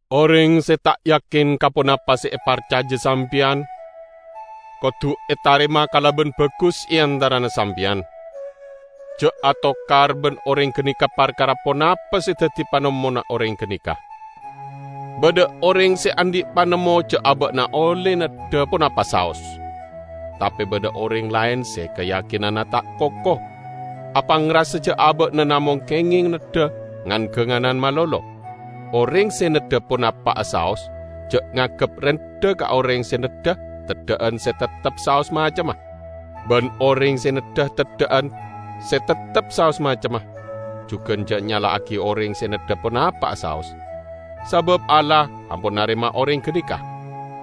Oreng se ta' yakin ka ponapa se eparcaja sampeyan kodu etarema kalaban bagus e antarana sampeyan. Ja' atokar ban oreng ganeka parkara ponapa se daddi panemmona oreng ganeka. Badha oreng se andhi' panemmo ja' aba'na olle neddha ponapa saos. Tape badha oreng laen se kayakinanna ta' koko; apangrasa ja' aba'na namong kengeng neddha ngan-ganganan malolo. Oreng se neddha ponapa'a saos ja' nganggep rendha ka oreng se neddha teddha'an se teptep saos macemma; ban oreng se neddha teddha'an se teptep saos macemma, jugan ja' nyala'agi oreng se neddha ponapa'a saos, sabab Allah ampon narema oreng ganeka.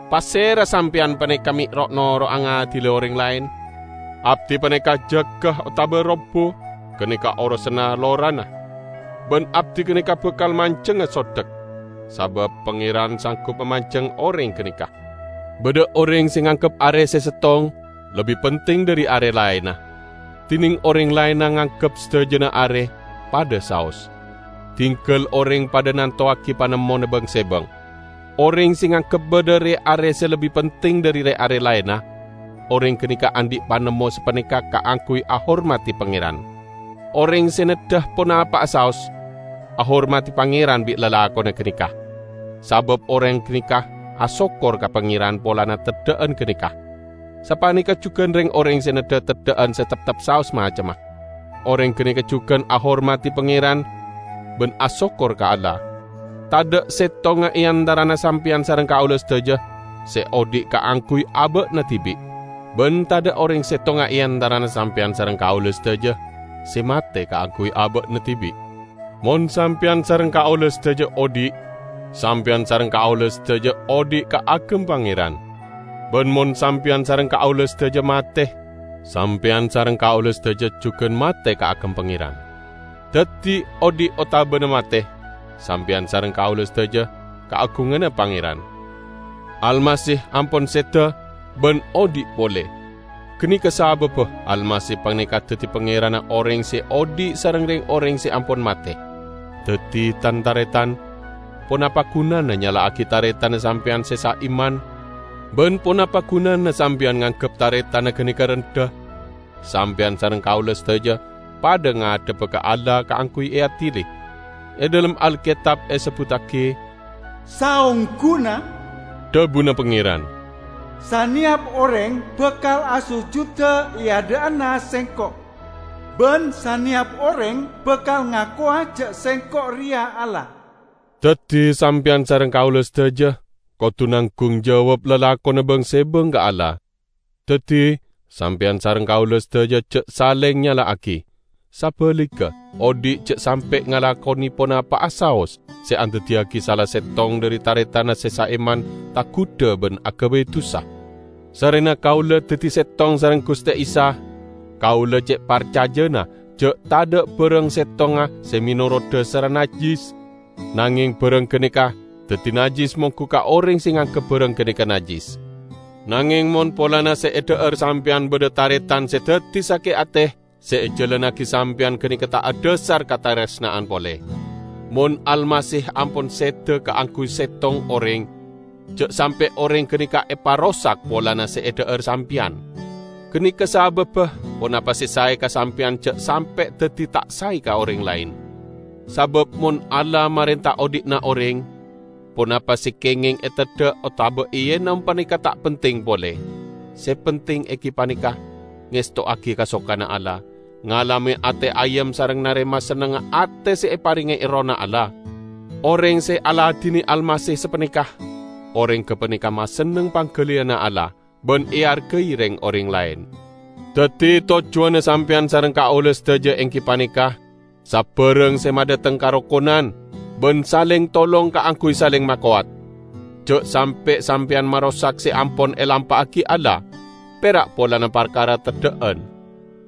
Pasera sampeyan paneka me' ro'-noro'a ngadili oreng laen? Abdi paneka jaga otaba robbu, ganeka orosanna lorana. Ban abdi ganeka bakal manjengnga sodek, sabab Pangeran sanggup mamanjeng oreng ganeka. Badha oreng se nganggep are se settong lebbi penting dhari are laenna, dineng oreng laenna nganggep sadajana are padha saos. Dinggal oreng padha nantowagi panemmona bang-sebang. Oreng se nganggep badha re-are se lebbi penting dhari re-are laenna, oreng ganeka andhi' panemmo sapaneka kaangguy ahormadi Pangeran. Oreng se neddha ponapa'a saos, ahormadi Pangeran bi' lalakonna ganeka, sabab oreng ganeka asokkor ka Pangeran polana teddha'an ganeka. Sapaneka jugan reng-oreng se neddha teddha'an se teptep saos macemma; oreng ganeka jugan ahormadi Pangeran ban asokkor ka Allah. Tadha' settonga e antarana sampeyan sareng kaula sadaja se odhi' kaangguy aba'na dibi'; ban tadha' oreng settonga e antarana sampeyan sareng kaula sadaja se mate kaangguy aba'na dibi'. Mon sampeyan sareng kaula sadaja odhi', sampeyan sareng kaula sadaja odhi' kaagem Pangeran. Ban mon sampeyan sareng kaula sadaja mate, sampeyan sareng kaula sadaja jugan mate kaagem Pangeran. Daddi, odhi' otabana mate, sampeyan sareng kaula sadaja kaagunganna Pangeran. Almasih ampon seda ban odhi' pole. Ganeka sababba Almasih paneka daddi Pangeranna oreng se odhi' sareng reng-oreng se ampon mate. Daddi, tan-taretan, ponapa gunana nyala'agi taretanna sampeyan se saiman? Ban ponapa gunana sampeyan nganggep taretanna ganeka rendha? Sampeyan sareng kaula sadaja padha ngadhebba ka Allah kaangguy eadili. E dhalem Alketab esebbuttagi, "Saongguna," dhabuna Pangeran, "saneyap oreng bakal asojuda e adha'anna Sengko'; ban saneyap oreng bakal ngakowa ja' Sengko' reya Allah." Daddi sampeyan sareng kaula sadaja kodu nanggung jawab lalakonna bang-sebang ka Allah. Daddi, sampeyan sareng kaula sadaja ja' saleng nyala'agi. Sabaligga, oddi ja' sampe' ngalakone ponapa'a saos se andaddiyagi sala settong dhari taretanna se saiman tagudha ban agabay dusa. Sarrena kaula daddi settong sareng Guste Isa, kaula ce' parcajana ja' tadha' barang settonga se menorot dhasarra najjis; nangeng barang ganeka daddi najjis monggu ka oreng se nganggep barang ganeka najjis. Nangeng mon polana se edha'ar sampeyan badha taretan se daddi sake' ate, se ejalannagi sampeyan ganeka ta' adhasar kataresna'an pole. Mon Almasih ampon seda kaangguy settong oreng, ja' sampe' oreng ganeka eparosak polana se edha'ar sampeyan. Ganeka sababba ponapa se sae ka sampeyan ja' sampe' daddi ta' sae ka oreng laen. Sabab mon Allah marenta odhi'na oreng, ponapa se kengeng eteddha otaba eenom paneka ta' penting pole. Se penting enggi paneka ngestowagi kasokanna Allah, ngalame ate ayem sareng narema sennengnga ate se eparenge Errohna Allah. Oreng se aladine Almasih sapaneka, oreng gapaneka masenneng panggaliyanna Allah, ban eargai reng-oreng laen. Daddi tojjuwanna sampeyan sareng kaula sadaja enggi paneka sabarang se madhateng karokonan ban saleng tolong kaangguy saleng makowat. Ja' sampe' sampeyan marosak se ampon elampa'agi Allah, pera' polana parkara teddha'an.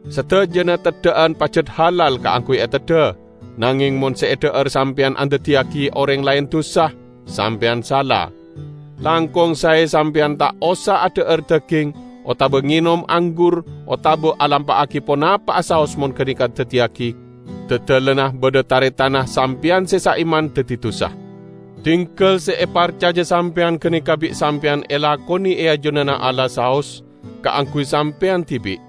Sadajana teddha'an pajat halal kaangguy eteddha, nangeng mon se edha'ar sampeyan andaddiyagi oreng laen dusa, sampeyan sala. Langkong sae sampeyan ta' osa adha'ar daging otaba ngenom anggur otaba alampa'agi ponapa'a saos mon ganeka daddiya dadalanna badha taretanna sampeyan se saiman daddi dusa. Dinggal se eparcaja sampeyan ganeka bi' sampeyan elakone e ajunanna Allah saos kaangguy sampeyan dibi'.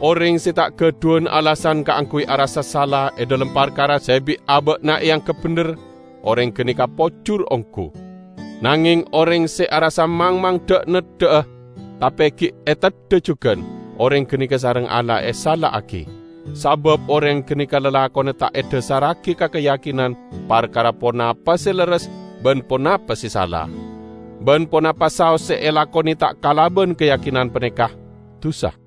Oreng se ta' gadhuwan alasan kaangguy arassa sala e dhalem parkara se bi' aba'na eanggep bendher, oreng ganeka pojur onggu. Nangeng oreng se arassa mangmang dha'-neddha'a, tape gi' eteddha jugan, oreng ganeka sareng Allah esala'agi; sabab oreng ganeka lalakonna ta' edhasarragi ka kayakinan parkara ponapa se lerres ban ponapa se sala. Ban ponapa saos se elakone ta' kalaban kayakinan paneka, dusa.